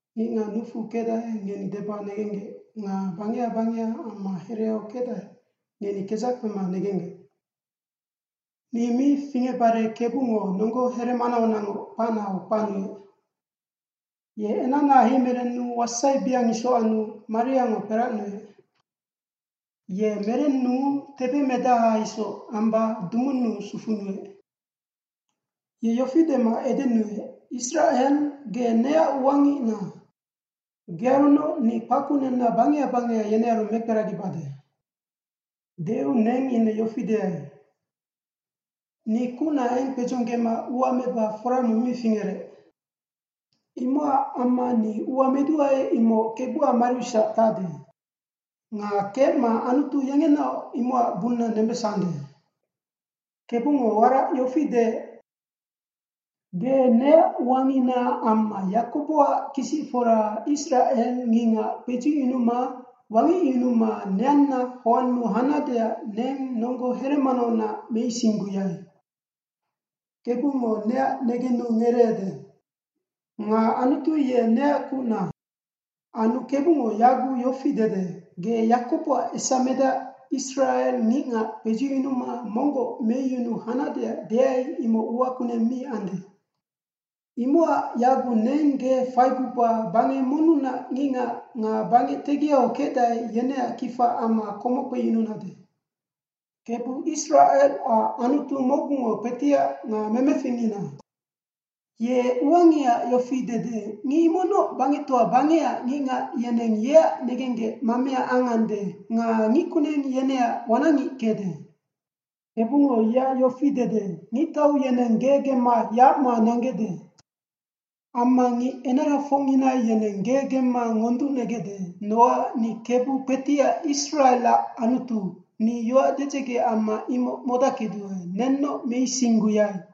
Ngicngac nucfu kecdae ngeni deba negenggec, nga bangeha bangeha amma hereau kecdae, ngeni kedzac kpema negenggec. Ni mi fingecbare KEBUNGO nonggo here manaunacngoc kpacnau kpacnuec. Ye enacna heimerennu wasaibeang isoc annu, mariango kperacnuec. Ye merennuu tebemedaha isoc amba dumunnu sufunuec. Ye yofi dema edenuec, “Isracel, ge neac uangicna. Gearunoc ni kpackunenna bangeha bangeha yenearu mekperagibade.” Deu neng ine yofi deai. “Ni kucna eng kpedzonggema ua meba fora mong mi fingerec. Imocac amma ni ua meduae imoc KEBUAC mariusac tacde. Nga kecma Anutu yengenaoc imocac bunna nembesande.” KEBUNGO warac yofi deec. Ge neac uangicna amma Yakoboac kisicfora Isracel ngicngac kpedzucyunuma, wangecyunuma neanna hoannu hanadeac neng nonggo heremanaunac meisingguyai. KEBUNGO neac negennenu ngereede. Nga Anutu ye neac kucna. Anu KEBUNGO yaguc yofi dede, “Ge Yakoboac esamedac Isracel ngicngac kpedzucyunuma monggoc meyunu hanadeac deai imoc ua kuneng mi ande. Imocac yaguc neng ge faiguba bangec monnunac ngicngac nga bangec tegiau kecdae yeneac kifa amma komoc kpeyununade.” KEBU Isracelac Anutu mocgungo Kpetiac nga Memeficngina. Ye uangihaac yofi dede, ngic imocnoc bangectoa bangecac ngicngac yeneng yeac negenggec mamea angande nga ngickuneng yeneac wanacngic kecde. KEBUNGO yeac yofi dede, “Ngictau yeneng ge gemma yacma nanggecde. Amma ngic enarafocngina yeneng ge gemma ngonducnegecde, nocac ni KEBU Kpetiac Isracelac Anutu, Ni yoac dedzege amma imoc modackeduae, nennoc meisingguyai.”